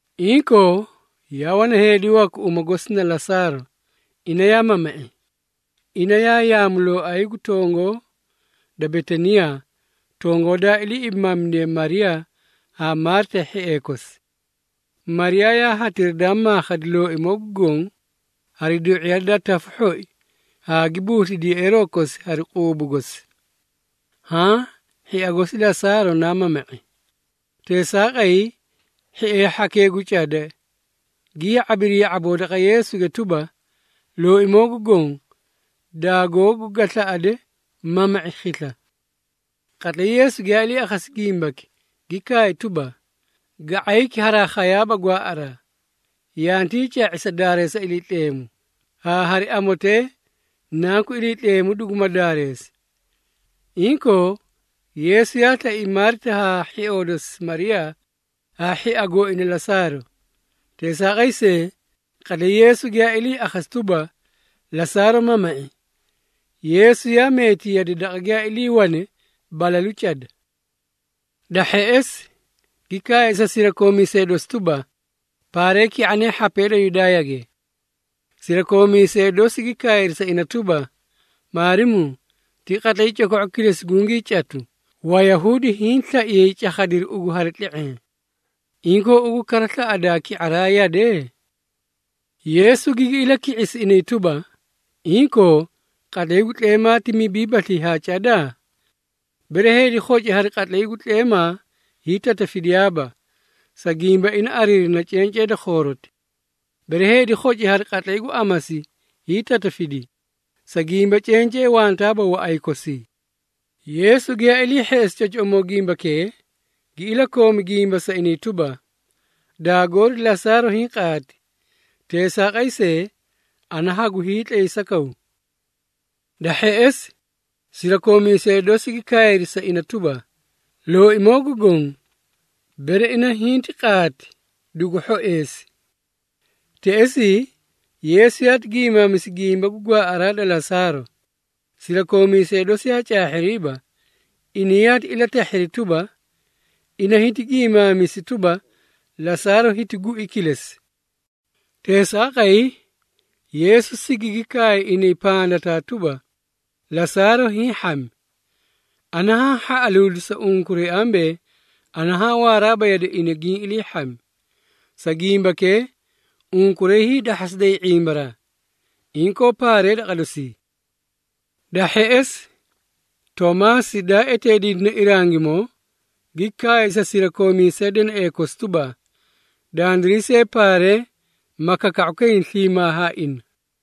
Inkoo, yaa wana heedi waku uma gosi na Lasaaro, ina yaa mama⁄i. Ina yaa yaamulooay gu tongoo da Betaniyaa, tongoo daa ilii ibimaamidiye Mariyaa haa Maarita hhiee kosi. Mariyaa na hatira daa maakhadi Looimoo gu Goõ hari du⁄iya da tafu hhoi haa gi busliti yeꞌeeroo kosi hari quubu gosi. Haã hhia gosi Lasaaro naa mama⁄i. Teesaaqay, hhiee hhanki gu cada gi ya⁄abiri ya⁄aboo daqa Yeesuge tuba, “Looimoo gu Goõ, daagoogu ga slaꞌade mama⁄i khisla.” Qatlay Yeesu giyaa ilii akhasi gimbaki gi kaay tuba, “Ga⁄ayki haraa khayaaba gwaaꞌaraa, yantii ca⁄i sa daareesa Iliitleemu, haa hari amotee Nanku Iliitleemu duguma daareesi.” Inkoo, Yeesu yaa slai Maarita haa hhioo dosi Mariyaa haa hhia gooina Lasaaro. Teesaaqay see, qatlay Yeesu giyaa ilii akhasi tuba, Lasaaro mama⁄i, Yeesu yaa meeti yade daqa giyaa iliiwane balalu cada. Da hheꞌesi, gi kaay sa sirakoomiisee dosi tuba, “Paaree ki⁄anee hhapee da Yudaayage.” Sirakoomiisee dosi gi kaayri sa ina tuba, “Maarimuu, ti qatlay coko⁄u kilesi gungii catu, Wayahuudi hiĩ slaiyay cakhadiru ugu hari tle⁄eẽ. Inkoo ugu kara slaꞌadaa ki⁄araa yade?” Yeesu gigi ilaki⁄isi inay tuba, “Inkoo, qatlay gu tleemaa ti mibiibaslii haa cada? Bere heedi khoci hari qatlay gu tleemaa hiitatafidiyaaba, sa gimba ina ariirina cencee da khooroti. Bere heedi khoci hari qatlay gu amasi hiitatafidi, sa gimba cencee wantaaba waꞌay kosii.” Yeesu giyaa ilii hheꞌesi cocoꞌomoo gimbakee, gi ilakoomi gimba sa inay tuba, “Daagoori Lasaaro hiĩ qaati, teesaaqay see, ana hagu hiitlaysakaw.” Da hheꞌesi, sirakoomiisee dosi gi kaayri sa ina tuba, “Looimoo gu Goõ, bere ina hinti qaati dugu hhoeesi.” Teꞌesii, Yeesu yaati giimaamisi gimba gu gwaaꞌaraa da Lasaaro. Sirakoomiisee dosi yaa caahhiriiba, inay yaati ilatahhiri tuba, ina hiti giimaamisi tuba, Lasaaro hiti gui kilesi. Teesaaqay, Yeesu sigigi kaay inay pandataa tuba, “Lasaaro hiĩ hhami. Ana haã hhaꞌaluudi sa unkuray ambee ana haã waaraaba yade ina giĩ ilii hhami. Sa gimbakee, unkuray hiidahhasiday ⁄imbaraa. Inkoo paaree daqa dosii.” Da hheꞌesi, Toomaasi daa eteediidine Irangimoo, gi kaay sa sirakoomiisee deneꞌee kosi tuba, “Dandiray see paaree, ma kaka⁄ukayni sliimaa haa ina.”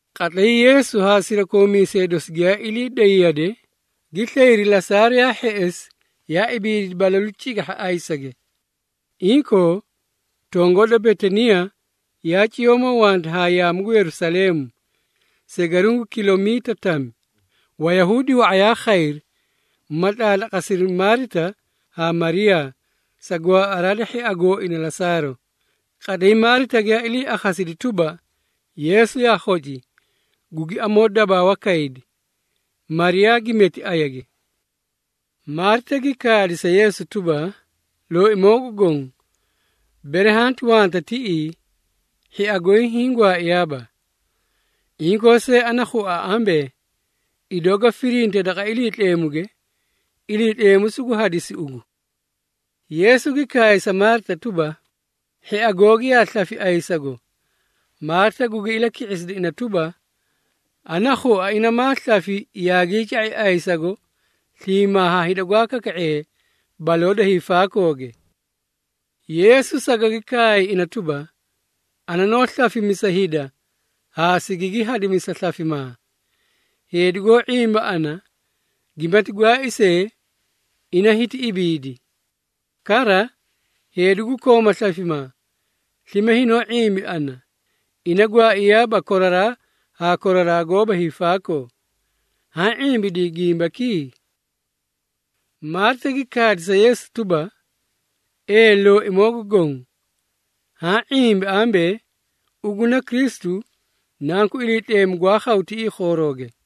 Qatlay Yeesu haa sirakoomiisee dosi giyaa ilii day yade, gi slayri Lasaaro yaa hheꞌesi yaa ibiidi balalu cigahha ayisage. Inkoo, tongoo da Betaniyaa yaa ciyoomoo wanta haa yaamu gu Yerusaleemu, segaruũ gu kilomiita tami. Wayahuudi wa⁄a yaa khayri, ma tlaatlaqasiri Maarita haa Mariyaa, sa gwaaꞌaraa da hhia gooina Lasaaro. Qatlay Maarita giyaa ilii akhasidi tuba, Yeesu yaa khoci, gugi amoodabaawa kaydi. Mariyaa gi meti ayage. Maarita gi kaadi sa Yeesu tuba, “Looimoo gu Goõ, bere hanti wanta tiꞌii, hhia goy hiĩ gwaaiyaaba. Inkoo see ana khua ambee, idoo ga firinte daqa Iliitleemuge, Iliitleemu sugu hadisi ugu.” Yeesu gi kaay sa Maarita tuba, “Hhia googi yaa slafi ayisago.” Maarita gugi ilaki⁄isidi ina tuba, “Ana khua ina maa slafi yaagii ca⁄i ayisago sliimaa haa hida gwaa kaka⁄ee baloo da hiifaakooge.” Yeesu sagagi kaay ina tuba, “Ana noó slafimisa hida haa sigigi hadimisa slafimaa. Heedi goó ⁄imba ana, gimati gwaai see, ina hiti ibiidi. Kara, heedi gu koomaa slafimaa, slime hinoó ⁄imba ana, ina gwaaiyaaba koraraa haa koraraa goóba hiifaakoo. Haã ⁄imbidii gimbaki?” Maarita gi kaadi sa Yeesu tuba, “Ee Looimoo gu Goõ, haã ⁄imbi ambee, ugu na Kristu, Nanku Iliitleemu, gwaa khawa tiꞌii khoorooge.”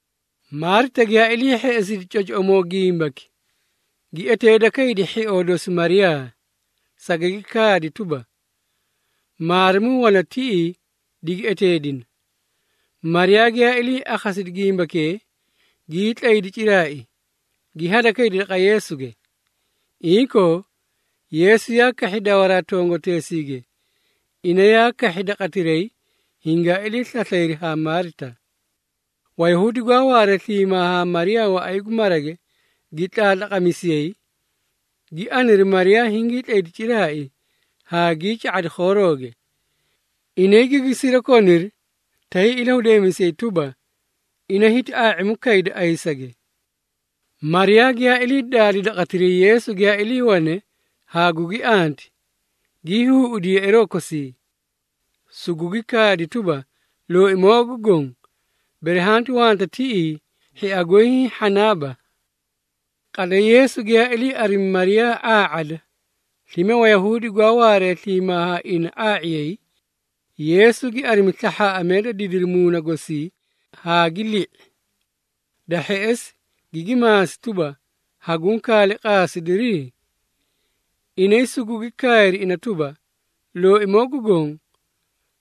Maarita giyaa ilii hheꞌesidi cocoꞌomoo gimbaki, gi eteeda kaydi hhioo dosi Mariyaa, sagagi kaadi tuba, “Maarimuu wana tiꞌii, digi eteedina.” Mariyaa giyaa ilii akhasidi gimbakee, gii tlaydi ciraai, gi hadakaydi daqa Yeesuge. Inkoo, Yeesu yaa kahhi dawaraa tongoteesiige, ina yaa kahhi daqatiray hingaa ilii slaslayri haa Maarita. Wayahuudi gwaa waaree sliimaa haa Mariyaa waꞌay gu marage gi tlaatlaqamisiyay, gi aniri Mariyaa hingii tlaydi ciraai haa gii ca⁄adi khoorooge. Inay gigi sirakoniri tay ilahudeemisiyay tuba, ina hiti ⁄aa⁄imu kayda ayisage. Mariyaa giyaa ilii daadi daqatiray Yeesu giyaa iliiwane haa gugi anti, gii huuꞌudi yeꞌeeroo kosii. Sugugi kaadi tuba, “Looimoo gu Goõ, bere hanti wanta tiꞌii, hhia goy hiĩ hhanaaba.” Qatlay Yeesu giyaa ilii arimi Mariyaa ⁄aa⁄ada, slime Wayahuudi gwaa waaree sliimaa haa ina ⁄aa⁄iyay, Yeesu gi arimi slahhaaꞌamee da didiri muuna gosii haa gi li⁄i. Da hheꞌesi, gigi maasi tuba, “Haguũ kaale qaasidiri?” Inay sugugi kaayri ina tuba, “Looimoo gu Goõ,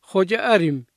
khoca arimi.”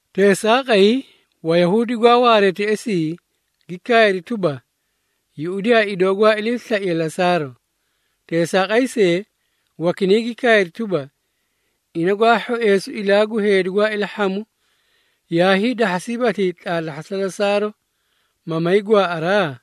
Teesaaqay, Wayahuudi gwaa waaree teꞌesii, gi kaayri tuba, “Yuꞌudiyaa idoo gwaa iliislaiye Lasaaro!” Teesaaqay see, wakinay gi kaayri tuba, “Ina gwaa hhoeesu ilaa gu heedi gwaa ilahhamu, yaa hiidahhasiibaslii tlaatlahhasa Lasaaro, ma may gwaaꞌaraa?”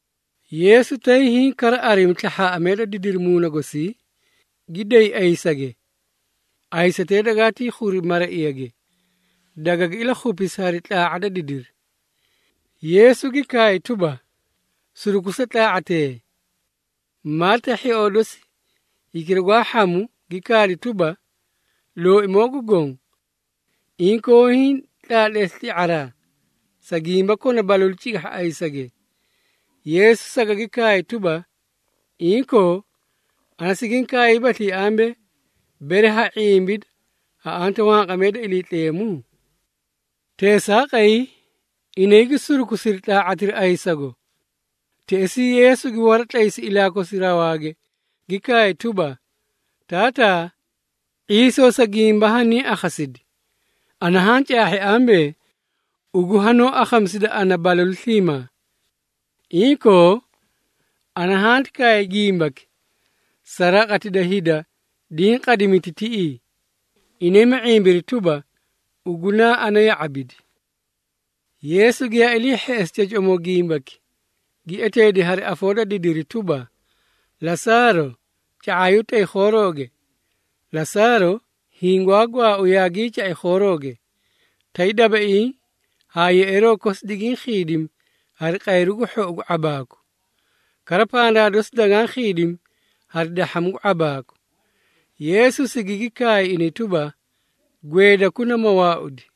Yeesu tay hiĩ kara arimi slahhaaꞌamee da didiri muuna gosii, gi day ayisage. Ayisatee dagaatii khuri maraiyage, dagagi ilakhupisi hari tlaa⁄a da didiri. Yeesu gi kaay tuba, “Surukusa tlaa⁄atee.” Maarita hhioo dosi hikira gwaa hhamu gi kaadi tuba, “Looimoo gu Goõ, inkoo hiĩ tlaatleesi tli⁄araa, sa gimba kona balalu cigahha ayisage!” Yeesu sagagi kaay tuba, “Inkoo, ana sigiĩ kaaybaslii ambee, bere ha ⁄imbida ha anta wanqamee da Iliitleemu?” Teesaaqay, inay gi surukusiri tlaa⁄atira ayisago. Teꞌesii, Yeesu gi waratlaysi ilaa kosi rawaage gi kaay tuba, “Taataa, ⁄iisoo sa gimba haniĩ akhasidi. Ana haa caahhi ambee, ugu hanoó akhamisida ana balalu sliimaa. Inkoo ana hanti kaay gimbaki, sa raqati da hida diĩ qadimiti tiꞌii, inay ma ⁄imbiri tuba, ugu naa ana ya⁄abidi.” Yeesu giyaa ilii hheꞌesi cocoꞌomoo gimbaki, gi eteedi hari afoo da didiri tuba, “Lasaaro, ca⁄aayu tay khoorooge!” Lasaaro, hiĩ gwaa gwaau yaagii ca⁄i khoorooge, tay dabaiĩ haa yeꞌeeroo kosi digiĩ khiidimi hari qayru gu hhou gu ⁄abaaku. Kara pandaa dosi dagaã khiidimi hari dahhamu gu ⁄abaaku. Yeesu sigigi kaay inay tuba, “Gweedakuna ma waaudi.”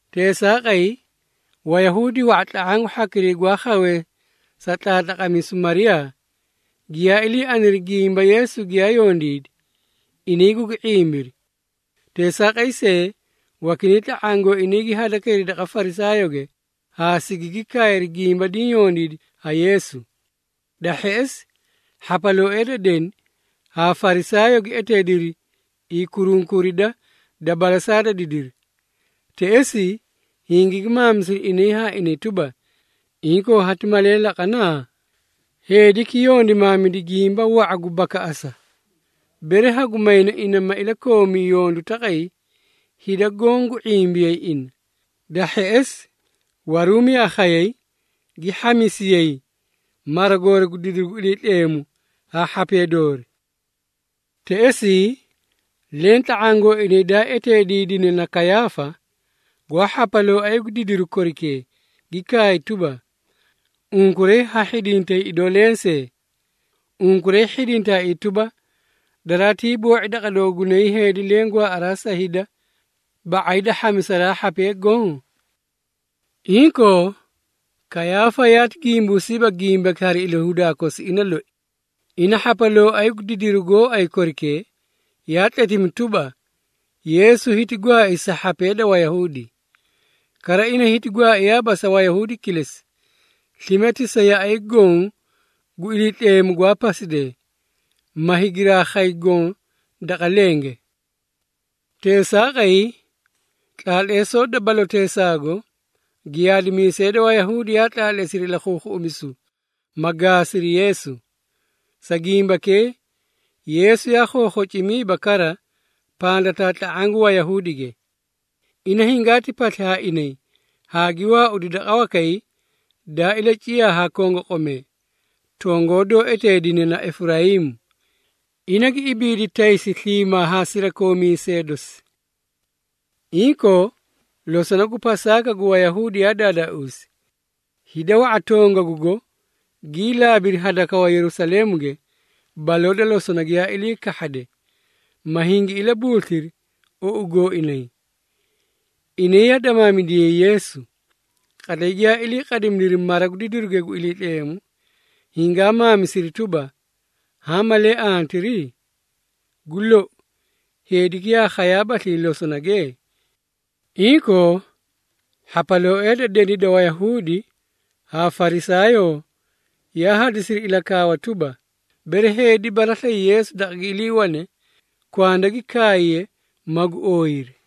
Teesaaqay, Wayahuudi wa⁄a tla⁄aã gu hhakiray gwaa khawee sa tlaatlaqamisu Mariyaa, giyaa ilii aniri gimba Yeesu giyaa yondiidi, inay gugi ⁄imbiri. Teesaaqay see, wakinay tla⁄aã gooinaa gi hadakayri daqa Farisaayooge, haa sigigi kaayri gimba diĩ yondiidi ha Yeesu. Da hheꞌesi, hhapalooee da deni haa Farisaayoo gi eteediri hiikurunkurida da balasaa da didiri. Teꞌesii, hingigi maamisiri inay haa inay tuba, “Inkoo hati malee laqana? Heediki yondimaamidi gimba wa⁄a gu bakaꞌasa. Bere hagu mayna ina ma ilakoomi yondu taqay, hida goõ gu ⁄imbiyay ina. Da hheꞌesi, Waruumi yaa khayay gi hhamisiyay mara goori gu didiru gu Iliitleemu haa hhapee doori.” Teꞌesii, leẽ tla⁄aã gooinay daa eteediidine na Kayaafa, gwaa hhapalooay gu didiru korikee, gi kaay tuba, “Unkuray ha hhidintay idoo lensee! Unkuray hhidintaaii tuba, daraatii boo⁄i daqa doogunay heedi leẽ gwaaꞌaraa sa hida, ba⁄ay da hhamisaraa hhapee goõ?” Inkoo, Kayaafa yaati gimbuusiiba gimbaki hari ilahudaa kosi ina loi. Ina hhapalooay gu didiru gooay korikee, yaa tletimi tuba, Yeesu hiti gwaai sa hhapee da Wayahuudi. Kara ina hiti gwaaiyaaba sa Wayahuudi kilesi, slime ti sa yaꞌay goõ gu Iliitleemu gwaa pasidee, ma higiraa khay goõ daqa lenge. Teesaaqay, tlaatleesoo da baloteesaago, giyaadimiisee da Wayahuudi yaa tlaatleesiri ilakhuukhuꞌumisu, ma gaasiri Yeesu. Sa gimbakee, Yeesu yaa khookhocimiiba kara pandataa tla⁄aã gu Wayahuudige. Ina hingaati pasli haa inay haa gi waaudi daqa wakay daa ilaciyaa haa kongoqomee, tongoo doó eteedine na Efurayiimu. Ina gi ibiidi taysi sliimaa haa sirakoomiisee dosi. Inkoo, losona gu Pasaaka gu Wayahuudi yaa daadaauusi. Hida wa⁄a tongagugo gii laabiri hadakawa Yerusaleemuge baloo da losona giyaa ilii kahhade, ma hingi ilabuusliri ou gooinay. Inay yaa damaamidiyay Yeesu. Qatlay giyaa ilii qadimidiri mara gu didiruge gu Iliitleemu, hingaa maamisiri tuba, “Haã malee antiri? Gu lou, heediki yaa khayaabaslii losonage?” Inkoo, hhapalooee da deni da Wayahuudi haa Farisaayoo yaa hadisiri ilakaawa tuba, bere heedi baraslayi Yeesu daqa gi iliiwane, kwanda gi kaayiye, magu ooyiri.